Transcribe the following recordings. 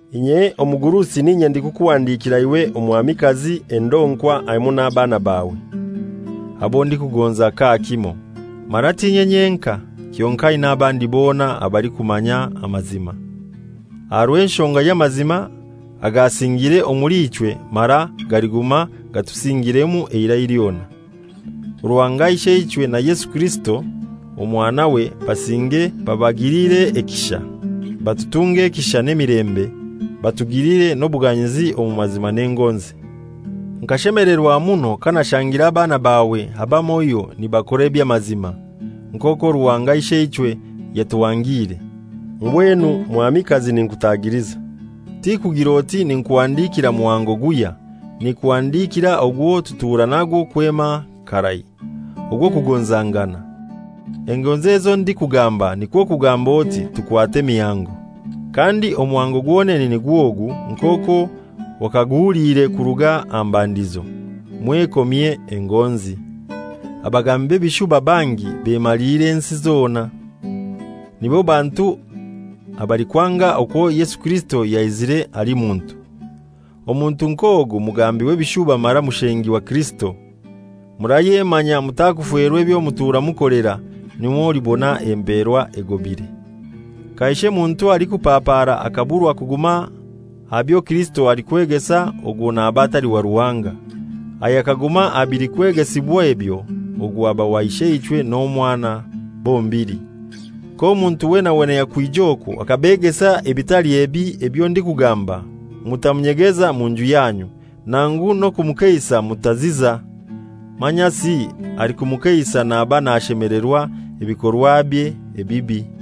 Inye omugurusi n'inye ndikukuhandikira iwe Omwamikazi endonkwa hamoi n'abaana bawe, abo ndikugonza kakimoi. Mara t'inye nyenkai, kyonkai n'abandi bona abalikumanya amazima, aha rw'enshonga y'amazima agasingiire omuli ichwe mara galiguma gatusingiiremu eirai lyona. Ruhanga Isheichwe na Yesu Kirisito Omwanawe basinge babagilire ekisha, batutunge ekisha n'emilembe, batugilire n'obuganyizi omu mazima n'engonzi. Nkashemelerwa muno kanashangire abaana bawe abamoi nibakora eby'amazima, nk'okwo Ruhanga Isheichwe yatuhangiire. Mbwenu Mwamikazi ninkutagiliza, tikugir'oti ninkuhandikira muhango guhya, ninkuhandikira ogwo tutura nagwo kwema karai, ogw'okugonzangana. Engonzi ezo ndikugamba nikwo kugamb'oti tukwate emihango. Kandi omuhango gwonene nigw'ogu nk'okwo wakaguhuliire kuruga aha mbandizo: Mwekomye engonzi. Abagambi b'ebishuba bangi bemaliire ensi zona, nibo bantu abalikwanga okwo Yesu Kirisito yaizire ali muntu. Omuntu nk'ogu mugambi w'ebishuba mara mushengi wa Kirisito. Murayemanya mutakuferwa ebyo mutura mukolera, nirwo mulibona empeerwa egobire. Kaishe muntu alikupapaara akaburwa kuguma aha byo Kirisito alikwegesa ogwo naba atali wa Ruhanga. Ayakaguma aha bilikwegesibwa ebyo, ogwo aba wa Isheichwe n'omwana bombili. K'omuntu wena wena yakwija okwo akabegesa ebitali ebi ebyo ndikugamba, mutamunyegeza mu nju yanyu, nangu n'okumukeisa mutaziza. Manyasi alikumukeisa naba nashemelerwa ebikorwabye ebibi.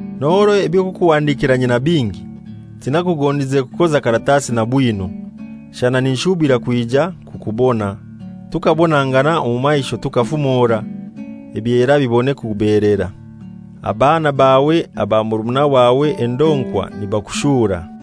N'orwo eby'okukuhandikira nyina bingi, tinakugondize kukoza karatasi na bwino. Shana ninshubira kwija kukubona, tukabonangana omu maisho tukafumora, ebyera bibone kugobeelera. Abaana bawe aba murumuna wawe endonkwa nibakushura.